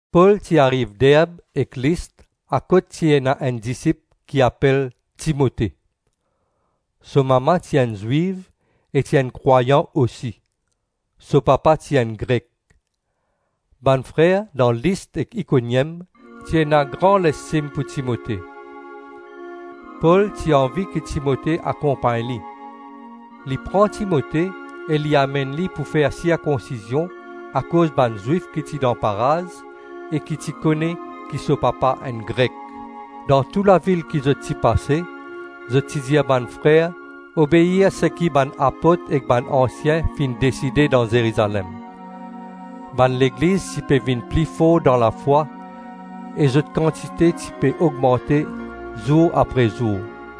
Pol ti ariv Derb ek List akot ti ena enn disip ki apel Timote. So mama ti enn Zwiv e ti enn krwayan osi. So papa ti enn Grek. Bann frer dan List ek Ikoniem ti ena gran lestim pou Timote. Pol ti anvi ki Timote akonpagn li. Li pran Timote e li amenn li pou fer sirkonsizion akoz bann Zwif ki ti dan paraz, e ki ti kone ki so papa enn Grek. Dan tou lavil ki zot ti pase, zot ti dir bann frer obeir seki bann apot ek bann ansien finn deside dan Zerizalem. Bann legliz ti pe vinn pli for dan lafwa e zot kantite ti pe ogmante zour apre zour.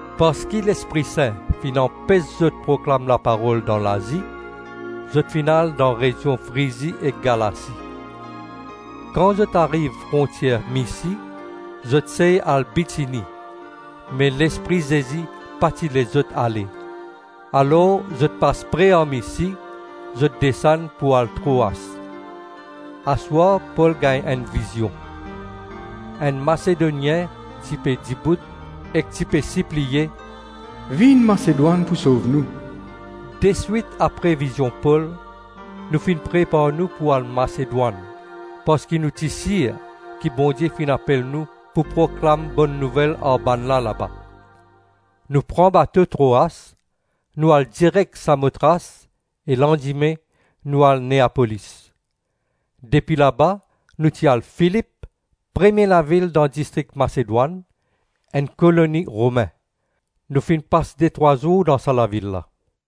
Parski Lespri Sin finn anpes zot proklam laparol dan Lazi, zot finn al dan rezion Frizi ek Galasi. Kan zot ariv frontier Misi, zot sey al Bitini, me Lespri Zezi pa ti les zot ale, alors zot pas pre ar Misi zot desann pou al Troas. Aswar Pol gagn enn vizion. Enn Masedonien ti pe dibout ek ti pe sipliye, “Vinn Masedwann pou sov nou.” Deswit apre vizion Pol, nou finn prepar nou pou al Masedwann parski nou ti sir ki Bondie finn apel nou pou proklam Bonn Nouvel ar bannla laba. Nou pran bato Troas, nou al direk Samotras e landime nou al Neapolis. Depi laba nou ti al Filip, premie lavil dan distrik Masedwann, enn koloni Romin. Nou finn pas detrwa zour dan sa lavil la.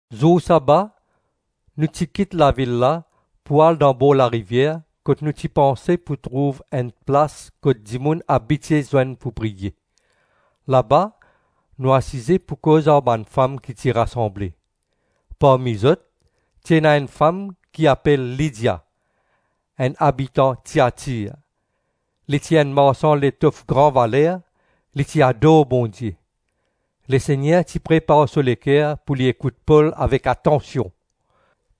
Zour saba nou ti kit lavil la pou al dan bor larivier kot nou ti panse pou trouv enn plas kot dimoun abitie zwenn pou priye; laba nou asize pou koz ar bann fam ki ti rasanble. Parmi zot ti ena enn fam ki apel Lidia, enn abitan Tiatir. Li ti enn marsan letof gran valer, li ti ador Bondie. Lesegner ti prepar so leker pou li ekout Pol avek atansion.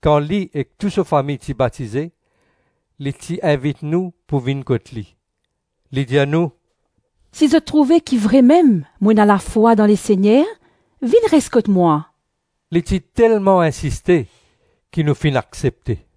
Kan li ek tou so fami ti batize, li ti invit nou pou vinn kot li. Li dir nou, “Si zot trouve ki vremem mo ena lafwa dan Lesegner, vinn res kot mwa.” Li ti telman insiste ki nou finn aksepte.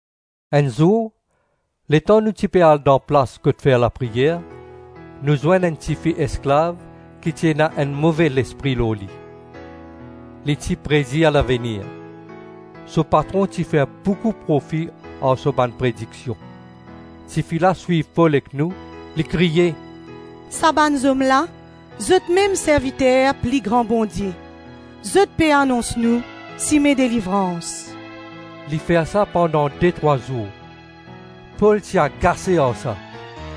Enn zour, letan nou ti pe al dan plas kot fer lapriyer, nou zwenn enn tifi esklav ki ti ena enn move lespri lor li. Li ti predir lavenir. So patron ti fer boukou profi ar so bann prediksion. Tifi la swiv Pol ek nou, li kriye, “Sa bann zom la, zotmem serviter pli Gran Bondie; zot pe anons nou sime delivrans.” Li fer sa pandan detrwa zour. Pol ti agase ar sa,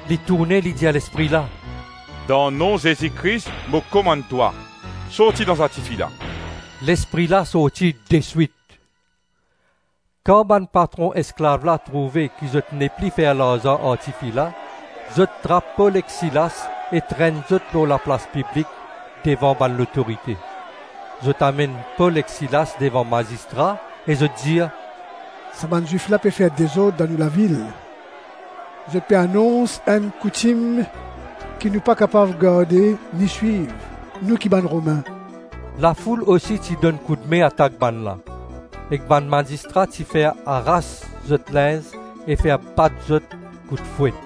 li tourne li dir lespri la, “Dan nom Zezi Kris mo komann twa sorti dan sa tifi la.” Lespri la sorti deswit. Kan bann patron esklav la trouve ki zot nepli fer larzan ar tifi la, zot trap Pol ek Silas e trenn zot lor la plas piblik devan bann lotorite. Zot amenn Pol ek Silas devan mazistra, e zot dir, “Sa bann Zwif la pe fer dezord dan nou lavil. Zot pe anons enn koutim ki nou pa kapav garde ni swiv, nou ki bann Romin.” Lafoul osi ti donn koudme atak bannla, ek bann mazistra ti fer aras zot linz e fer bat zot kout fwet.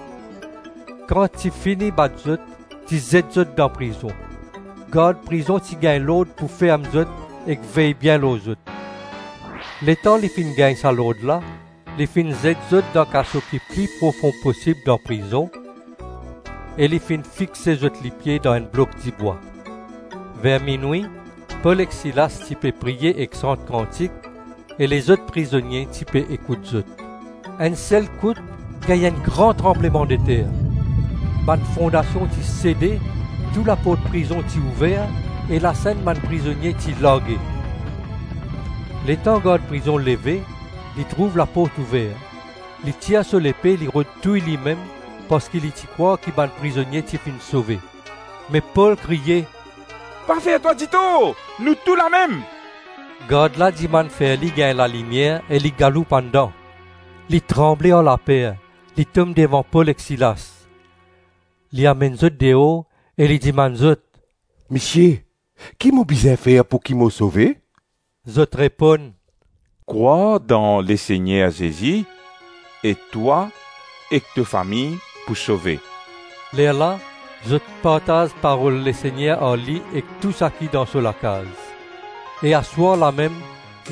Kan ti fini bat zot, ti zet zot dan prizon. Gard prizon ti gagn lord pou ferm zot ek vey bien lor zot. Letan li finn gagn sa lord la, li finn zet zot dan kaso ki pli profon posib dan prizon, e li finn fixe zot lipie dan enn blok dibwa. Ver minwi Pol ek Silas ti pe priye ek sant kantik e lezot prizonie ti pe ekout zot. Enn selkout gagn enn gran tranblemandeter, bann fondasion ti sede, tou laport prizon ti ouver e lasenn bann prizonie ti large. Letan gard prizon leve, li trouv laport ouver. Li tir so lepe, li rod touy limem parski li ti krwar ki bann prizonie ti finn sove. Me Pol kriye, “Pa fer twa ditor. Nou tou lamem.” Gard la dimann fer li gagn lalimier e li galoup andan. Li tranble ar laper, li tom devan Pol ek Silas. Li amenn zot deor e li dimann zot, “Misie, ki mo bizin fer pouki mo sove?” Zot reponn, “Krwar dan Lesegner Zezi, e twa ek to fami pou sove.” Lerla zot partaz parol Lesegner ar li ek tou saki dan so lakaz. E aswar lamem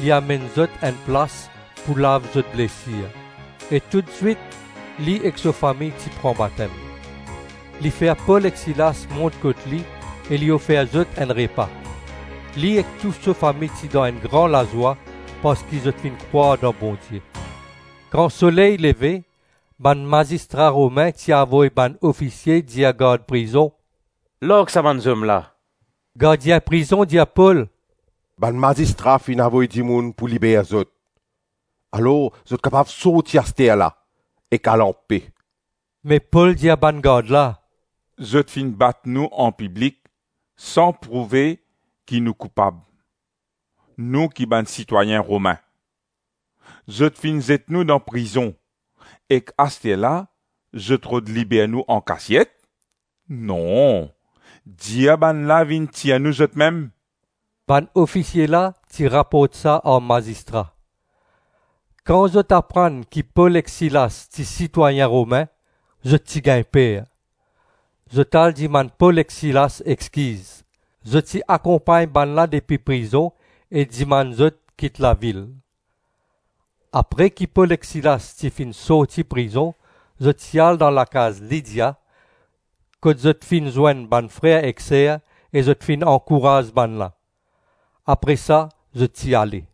li amenn zot enn plas pou lav zot blesir; e toutswit li ek so fami ti pran batem. Li fer Pol ek Silas mont kot li e li ofer zot enn repa. Li ek tou so fami ti dan enn gran lazwa parski zot finn krwar dan Bondie. Kan soley leve, bann mazistra Romin ti avoy bann ofisie dir gard prizon, “Larg sa bann zom la.” Gardien prizon dir Pol, “Bann mazistra finn avoy dimoun pou liber zot, alors zot kapav sorti asterla ek al anpe.” Me Pol dir ar bann gard la, “Zot finn bat nou anpiblik san prouve ki nou koupab, nou ki bann sitwayin Romin. Zot finn zet nou dan prizon; ek asterla zot rod liber nou ankasiet? Non! Dir bannla vinn tir nou zotmem.” Bann ofisie la ti raport sa ar mazistra. Kan zot aprann ki Pol ek Silas ti sitwayin Romin, zot ti gagn per. Zot al dimann Pol ek Silas exkiz. Zot ti akonpagn bannla depi prizon e dimann zot kit lavil. Apre ki Pol ek Silas ti finn sorti prizon zot ti al dan lakaz Lidia kot zot finn zwenn bann frer ek ser, e zot finn ankouraz bannla. Apre sa zot ti ale.